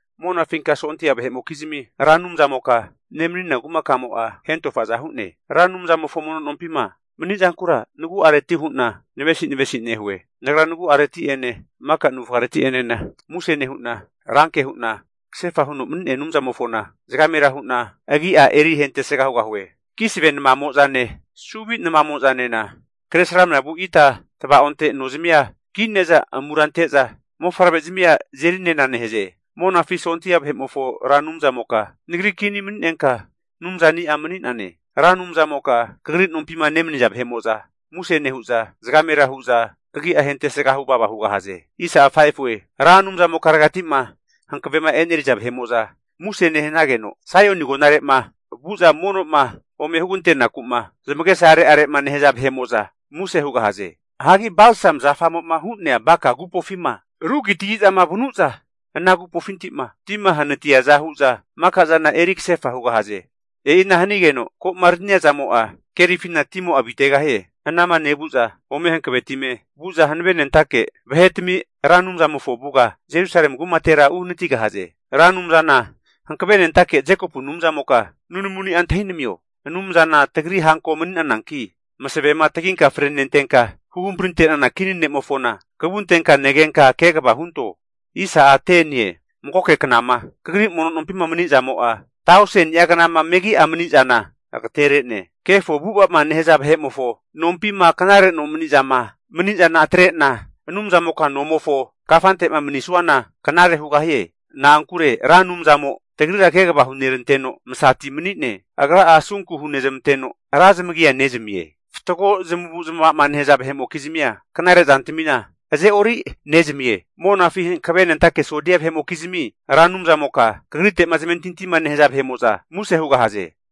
Monafinka Sondia vahe'mokizmi Ra Anumzamoka nemanina kumakamo'a hentofaza hu'ne. Ra Anumzamofo mono nompima mani'zankura nagu'areti hu'na navesinavesi nehue. Nagra nagu'areti'ene, maka navufgareti'enena muse nehu'na ranke hu'na kasefa huno mani'nea Anumzamofona zagamera hu'na agi'a ahentesga hugahue. Kisve namamo'zane suvi namamo'zanena kresramna vu ita tava'onte nozmia kine'za amura ante'za mofavre'zmia azeri'nena nehaze. Monafi sondia vahe'mofo Ra Anumzamoka nagri kini mani'nenka, Anumzani'a mani'nane. Ra Anumzamoka kagri nompima nemaniza vahe'mo'za muse nehu'za, zagamera hu'za kagia ahentesga huvava hugahaze. Ra Anumzamokaregati'ma hankavema e'neriza vahe'mo'za muse nehanageno, Saioni agonare'ma vu'za mono'ma ome hugante'naku'ma zamagesa are'are'ma nehaza vahe'mo'za muse hugahaze. Hagi balsam zafamo'ma hu'nea Baka agupofima rugitagi'zama vanu'za, ana agupofinti'ma tima hanatiaza hu'za maka zana eri kasefa hugahaze. E'ina hanigeno ko'ma arania zamo'a, kerifina timo'a avitegahie. Anama nevu'za ome hankavetime vu'za hanavenentake vahetami Ra Anumzamofo avuga Jerusalemi kumatera uhanatigahaze. Ra Anumzana Hankavenentake Anumza Jekopu Anumzamoka nunamuni'a antahinamio. Anumzana tagri hanko mani'nananki, masavema taginka frenentenka huhamprinte'nana kini ne'mofona kavuntenka negenka kegava hunto. Magoke knama Kagri mono nompima mani'zamo'a, tauseni'a knama megi'ama mani'zana agatere'ne. Kefo avu'ava'ma nehaza vahe'mofo, nompima knare nomani'zama mani'zana atre'na, Anumzamoka nomofo kafante'ma mani'suana knare hugahie. Na'ankure Ra Anumzamo tagrira kegava huneranteno masati mani'ne. Agra'a asunku hunezmanteno razmagia nezamie. Fatgo zamavu zamavama nehaza vahe'mokizmia knare zantamina azeori nezamie. Monafi hankavenentake sondia vahe'mokizmi Ra Anumzamoka, kagrite'ma zamentintima nehaza vahe'mo'za muse hugahaze.